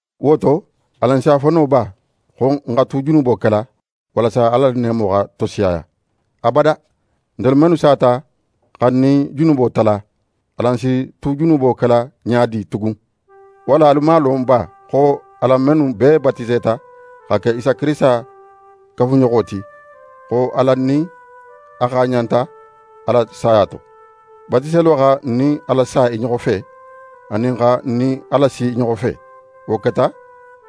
Wo to, alan si a fo no ba xo n xa tu junubo kela, walasa Ala la neemo xa tosiyaya? Abada! Ntelu mennu sata xa n nin junubo tala, alan si tu junubo kela ɲa di tugun? Walla alu man a lon ba xo alan mennu bee batiseta xa ke Isa Kirisita kafuɲoxo ti, xo alan nin a xaaɲanta a la saya to? Batiselo xa n nin a lasa i ɲoxo fe, anin xa n nin a lasi i ɲoxo fe. Wo keta,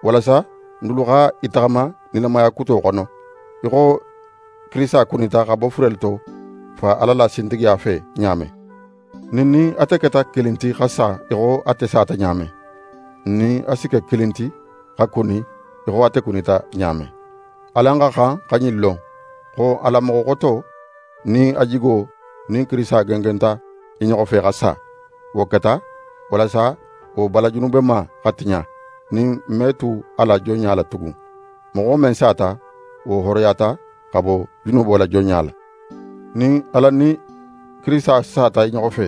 walasa n dulu xa i taxama nilamaya kuto xono, í xo Kirisita kunita xa bo furelu to Fa Ala la sintigiya fe ɲa men. Nin n nin ate keta kilin ti xa sa í xo ate sata ɲa men, n nin a si ke kilin ti xa kuni í xo ate kunita ɲa men. Alan xa xan xa ɲin lon xo alan moxo xoto nin a jigo nin Kirisita gengenta i ɲoxo fe xa sa. Wo keta, walasa wo bala junubema xa tiɲa, nin n me tu a la jonɲa la tugun. Moxo men sata, wo hooroyata xa bo junubo la jonɲa la. Nin alan nin Kirisita sata i ɲoxo fe,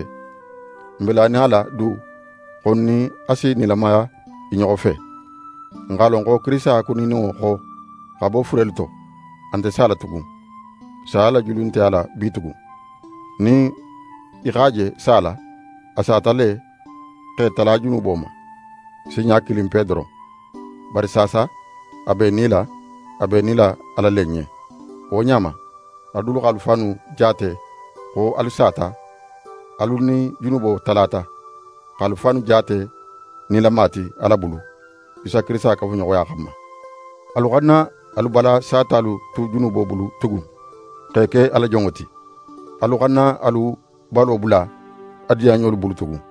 n be lanin a la du xo n nin a si nilamaya i ɲoxo fe. N x'a lon xo Kirisita kunininŋo xo xa bo furelu to, a nte sala tugun. Saya la julu nte a la bitugun. Nin í x'a je sala, a sata le x'é tala junubo ma, sinɲa kilinpe doron. Bari saasa, a be í nila, a be í nila Ala le ɲen. Wo ɲa ma, alu dulu x'alu fannu jaate xo alu sata, alu nin junubo talata, x'alu fannu jaate nilama ti Ala bulu, Isa Kirisita kafuɲoxoya xanma. Alu xana alu bala satalu tu junubo bulu tugun, x'e ke a la jonŋo ti. Alu xana alu balo bula a diyanɲolu bulu tugun.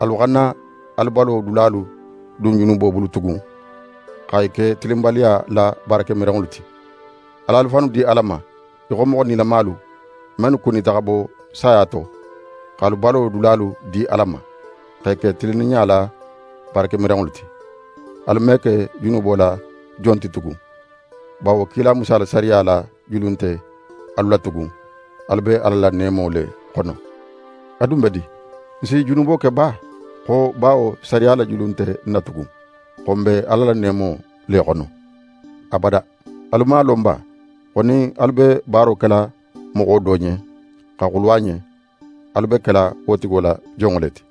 Alu xana alu balo dulalu dun junubo bulu tugun, xa i ke tilinbaliya la baarakemiranŋolu ti. Al'alu fannu di Ala ma, í xo moxo nilamalu, mennu kunita xa bo saya to, x'alu balo dulalu di Ala ma, x'e ke tilinninɲa la baarakemiranŋolu ti. Alu me ke junubo la jon ti tugun, bawo kila Musa la sariya la julu nte alu la tugun, alu be Ala la neemo le xono. A dun be di? N si junubo ke ba xo bawo sariya la julu nte n na tugun, xo n be Ala la neemo le xono? Abada! Alu man a lon ba xo nin alu be baaro kela moxo do ɲen, xa xulu a ɲen, alu be kela wo tigo la jonŋo le ti?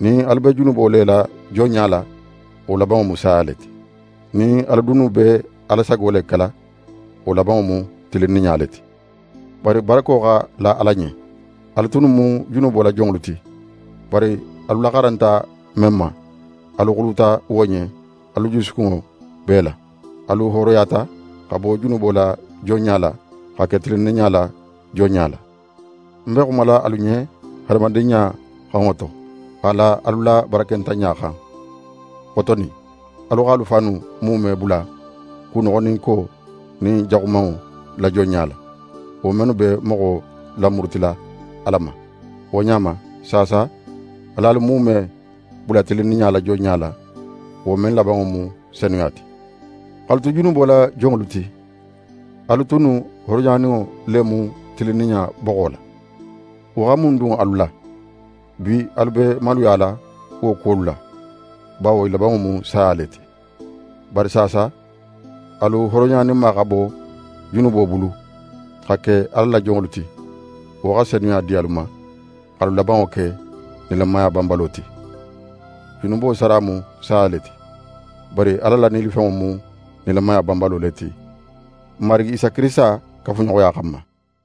Nin alu be junubo le la jonɲa la, wo labanŋo mu saya le ti. Nin alu dunnu be Ala sago le kela, wo labanŋo mu tilinninɲa le ti. Bari barako xa la Ala ɲen; alu tunnu mu junubo la jonŋolu ti, bari alu laxaranta men ma, alu xuluta wo ɲen alu jusukunŋo bee la. Alu hooroyata xa bo junubo la jonɲa la, xa ke tilinninɲa la jonɲa la. Ń be xumala alu ɲen hadamadinɲa xonŋo to, x'a la alu la barakentanɲa xan. Xotonin, alu x'alu fannu muume bula kunoxoninko nin jaxumanŋo la jonɲa la, wo mennu be moxo lamurutila Ala ma. Wo ɲa ma, saasa al'alu muume bula tilinninɲa la jonɲa la, wo men labanŋo mu senuya ti. X'alu tu junubo la jonŋolu ti, alu tunnu hooroyaninŋo le mu tilinninɲa boxo la. Wo xa mun dun alu la? Bi alu be maluyala wo kuwolu la; bawo i labanŋo mu saya le ti. Bari saasa, alu hooroyaninma xa bo junubo bulu, xa ke Ala la jonŋolu ti, wo xa senuya di alu ma, x'alu labanŋo ke nilamaya banbalo ti. Junubo sara mu saya le ti; bari Ala la nilifenŋo mu nilamaya banbalo le ti, n Marigi Isa Kirisita kafuɲoxoya xanma.